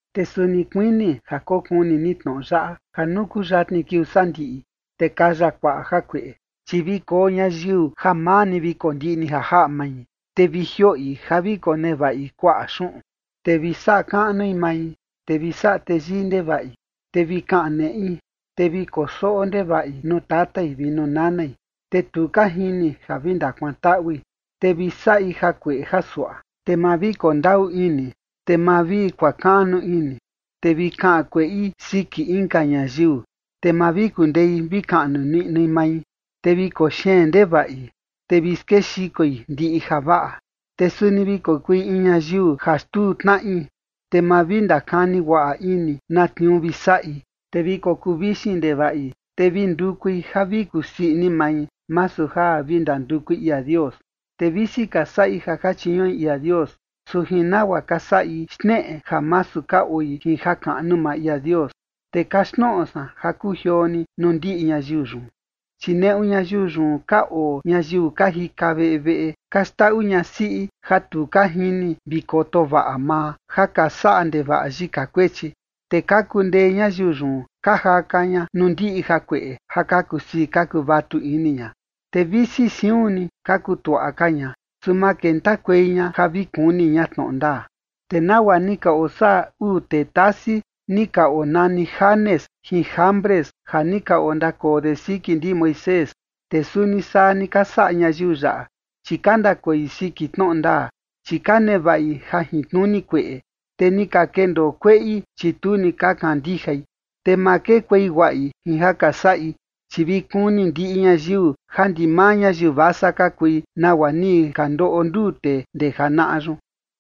Te suni kuini ja kokuni ni tnoꞌo yaꞌa: ja nuu kuu yatni kiuu sandiꞌi, te kaya kuaꞌa jakueꞌe. Chi vi koo ñayiu ja maa ni vi kondiꞌni ja jaꞌa mai, te vi jioꞌi ja vi konevaꞌi kuaꞌa xuꞌun, te vi saꞌa kaꞌnui mai, te vi saꞌa teyii ndevaꞌi, te vi kaꞌan neꞌi, te vi kosoꞌo ndevaꞌi nuu tatai vi nuu nanai, te tu ka jini ja vi ndakuantaꞌui, te vi saꞌi jakueꞌe jasuaꞌa, te ma vi kondaꞌu ini, te ma vi kuakaꞌnu ini, te vi kaꞌan kueꞌi siki inka ñayiu, te ma vi kundei vi kaꞌnu niꞌnui mai, te vi koxeen ndevaꞌi, te vi skexikoi ndiꞌi javaꞌa. Te suni vi kokui in ñayiu ja xtuu tnaꞌi, te ma vi ndakani guaꞌa ini na tniuu vi saꞌi, te vi kokuu vixin ndevaꞌi, te vi ndukui ja vi kusii ini mai, masu ja vi ndandukui ia Dios. Te visi ka saꞌi ja ka chiñuꞌi ia Dios, su jin nagua ka saꞌi xneꞌe ja masu ka oi jin jakaꞌnu maa ia Dios. Te kaxtnoꞌo san ja kujioo ni nuu ndiꞌi ñayiu yun. Chi neꞌu ñayiu yun ka oo ñayiu ka jika veꞌe veꞌe, ka xndaꞌu ñasiꞌi ja tu ka jini vi koto vaꞌa maa ja ka saꞌa ndevaꞌa yika kuechi, te ka kundee ñayiu yun ka jaka ña nuu ndiꞌi jakueꞌe ja ka kusii ka kuvatu ini ña. Te visi siun ni ka kutuaꞌa ka ña, su ma kentakuei ña ja vi kuni ña tnoꞌo ndaa. Te nagua ni ka osaꞌa uu tee tasi, ni ka onani Janes jin Jambres, ja ni ka ondakoo de siki ndi Moisés, te suni saa ni ka saꞌa ñayiu yaꞌa, chi ka ndakoi siki tnoꞌo ndaa, chi ka nevaꞌi jajintnuni kueꞌe, te ni ka kendoo kueꞌi, chi tu ni ka kandijai. Te ma kekuei guaꞌi jin ja ka saꞌi, chi vi kuni ndiꞌi ñayiu ja ndimaa ñayiu vasa ka kui, nagua ni ka ndoꞌo nduu tee ndee janaꞌa yun.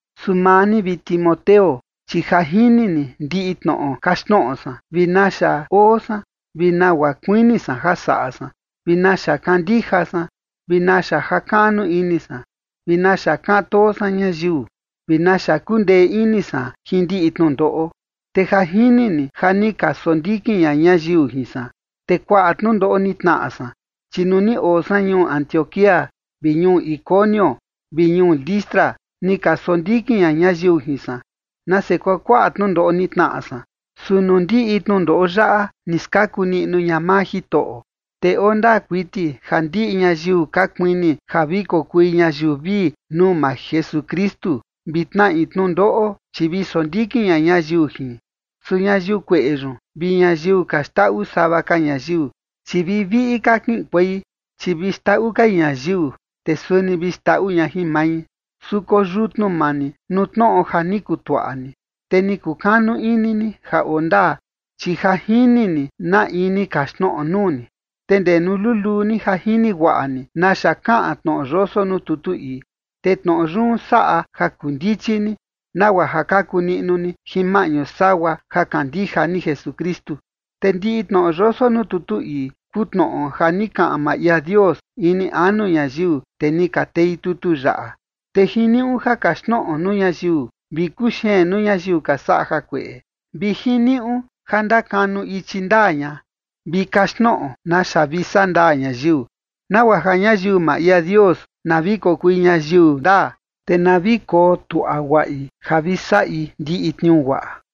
Su maa ni, vi Timoteo, chi ja jini ni ndiꞌi tnoꞌo kaxtnoꞌo san, vi naxa oo san, vi nagua kuini san ja saꞌa san, vi naxa kandija san, vi naxa jakaꞌnu ini san, vi naxa kaꞌan too san ñayiu, vi naxa kundee ini san jin ndiꞌi tnundoꞌo. Te ja jini ni ja ni ka sondikin ña ñayiu jin san, te kuaꞌa tnundoꞌo ni tnaꞌa san, chi nuu ni oo san ñuu Antioquía vi ñuu Iconio vi ñuu Listra, ni ka sondikin ña ñayiu jin san. ¡Nase kuakuaꞌa tnundoꞌo ni tnaꞌa san! Su nuu ndiꞌi tnundoꞌo yaꞌa ni skaku niꞌnu ña maa Jitoꞌo. Te oo ndaa kuiti ja ndiꞌi ñayiu ka kuini ja vi kokui ñayiu vii nuu maa Jesukristu, vi tnaꞌi tnundoꞌo, chi vi sondikin ña ñayiu jin. Su ñayiu kueꞌe yun vi ñayiu ka xndaꞌu sava ka ñayiu, chi vi viꞌi ka kiꞌinkuei, chi vi xndaꞌu kai ñayiu, te suni vi xndaꞌu ña jin mai. Su koyutnu maa ni nuu tnoꞌo ja ni kutuaꞌa ni, te ni kukanu ini ni ja oo ndaa, chi ja jini ni na in ni kaxtnoꞌo nuu ni. Te ndee nuu luluu ja jini guaꞌa ni naxa kaꞌan tnoꞌo yoso nuu tutu ii. Te tnoꞌo yun saꞌa ja kundichi ni, nagua ja kaku niꞌnu ni jin maꞌñu sagua ja kandija ni Jesukristu. Te ndiꞌi tnoꞌo yoso nuu tutu ii kuu tnoꞌo ja ni kaꞌan maa ia Dios ini anu ñayiu, te ni ka tei tutu yaꞌa, te jiniuꞌu ja kaxtnoꞌo nuu ñayiu, vi kuxeen nuu ñayiu ka saꞌa jakueꞌe, vi jiniuꞌu ja ndakanu ichi ndaa ña, vi kaxtnoꞌo naxa vi saꞌa ndaa ñayiu, nagua ja ñayiu maa ia Dios, na vi kokui ñayiu ndaa, te na vi kotuaꞌa guaꞌi ja vi saꞌi ndiꞌi tniuu guaꞌa.